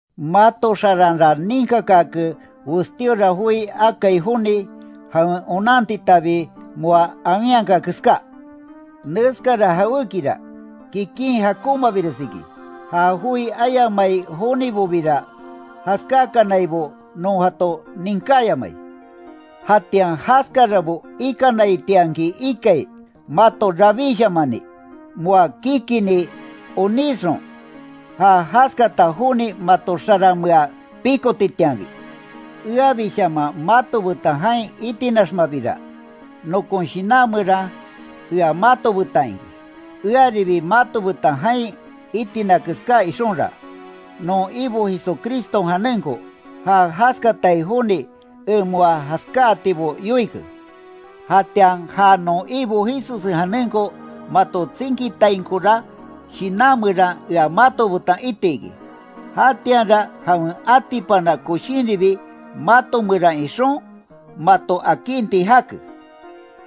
Mato xaranra ninkakaake, westíora joi akai joni, jawen onan titabi moa awinhaka keská. Neskara jawékira, kikin jakonmabires iki, ja joi ayamai jonibobira jaskákanaibo non jato ninkáyamai. Jatian jaskarabo ikanaitianki ikai, mato rabíshamani, moa kikini onísxon, ja jaskata joni mato xaranmea pikotitianbi. Eabishaman mato betan jain itinaxmabira, nokon shinan meran ea mato betan iki, earibi mato betan jain itina keská ixonra, non Ibo Jesucriston janenko, ja jaskatai joni en moa jaskáatibo yoike. Jatian ja non Ibo Jesussen janenko maton tsinkitainkora, shinan meran ea mato betan iti iki, jatianra jawen atipana koshinribi mato meran ixon, mato akinti jake.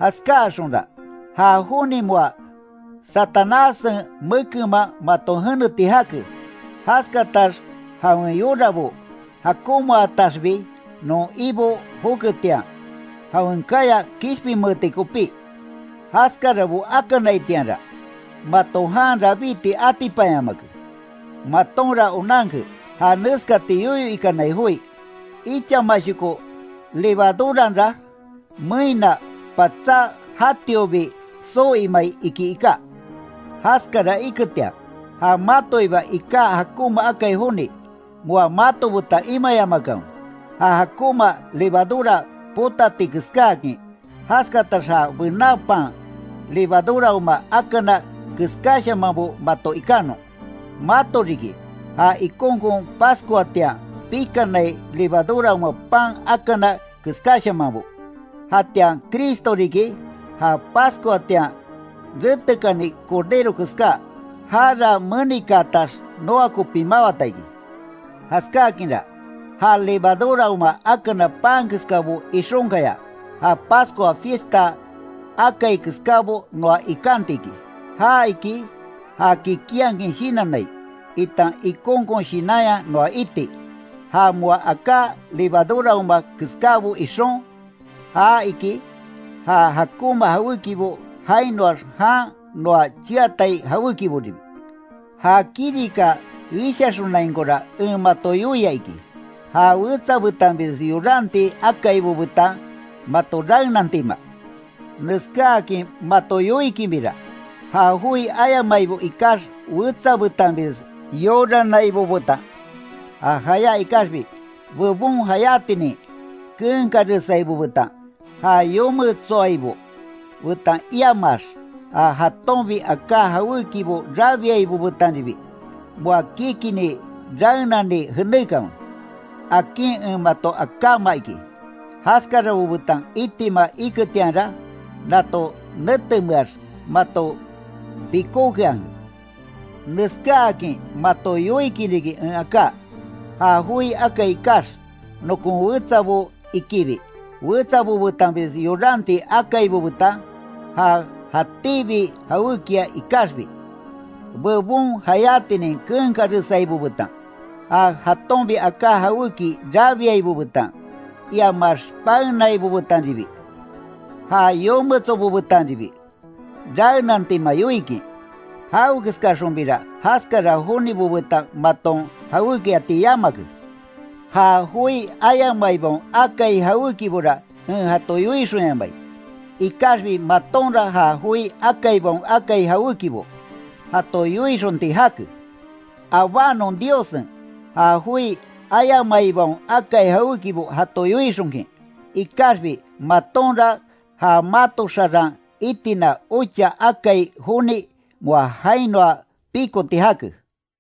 Jaskáaxonra, ja joni moa Satanássen mekenman maton jeneti jake, jaskatax jawen yorabo jakonmaataxbi non Ibo joketian, jawen kaya kishpinmeeti kopí Jaskarabo akanaitianra, mato jan rabíti atipanyamake, matonra onanke ja neskati yoyo ikanai joi: “Ichamashoko levaduranra, meínna patsá jatiobi soo imai”, iki iká. Jaskara iketian, ja matoiba iká jakonma akai joni, moa mato betan imayamakanwe, ja jakonma levadura potati keskáakin, jaskatax ja bená pan levaduraoma akana keskáshamanbo mato ikanon. Mato riki, ja ikonkon Pascuatian pikanai levaduraoma pan akana keskáshamanbo, jatian Cristo riki, ja Pascuatian retekani Cordero keská, jara menikaatax, noa kopi mawata iki. Jaskákinra, ja levaduraoma akana pan keskabo ixonkaya, ja Pascua fiesta akai keskábo noa ikanti iki, ja iki, ja kikinhakin shinannai, itan ikonkon shinanya noa iti. Ja moá aká levaduraoma keskábo ixon, ja iki, ja jakonma jawékibo jainoax jan noa cheatai jawékiboribi. Ja kirika wishaxonainkora en mato yoia iki, ja wetsa betanbires yoranti akaibo betan mato raenantima. Neskáakin mato yoikinbira, ja joi ayamaibo ikax wetsa betanbires yoranaibo betan, ja jayá ikaxbi, bebon jayátinin keenkaresaibo betan, ja yometsoaibo betan iamaax ja jatonbi aká jawékibo rabiaibo betanribi, moa kikini raenani jenékanwe, akin en mato akáma iki. Jaskarabo betan itima iketianra, nato netemeax mato pikókeanke. Neskáakin mato yoikin riki en aká: Ja joi akai ikax, nokon wetsabo ikibi, wetsabo betanbires yoranti akaibo betan, ja jatíbi jawékia ikaxbi, bebon jayátinin keenkaresaibo betan, ja jatonbi aká jawéki rabiaibo betan, iamax paenaibo betanribi, ja yometsobo betanribi, raenantima yoikin. Jawekeskaxonbira jaskara jonibo betan maton jawékiati yamake. Ja joi ayamaibaon akai jawékibora en jato yoixonyamai, ikaxbi matonra ja joi akaibaon akai jawékibo, jato yoixonti jake. Abánon Diossen, ja joi ayamaibaon akai jawékibo jato yoixonkin, ikaxbi matonra, ja mato xaran itina ocha akai joni moa jainoa pikoti jake.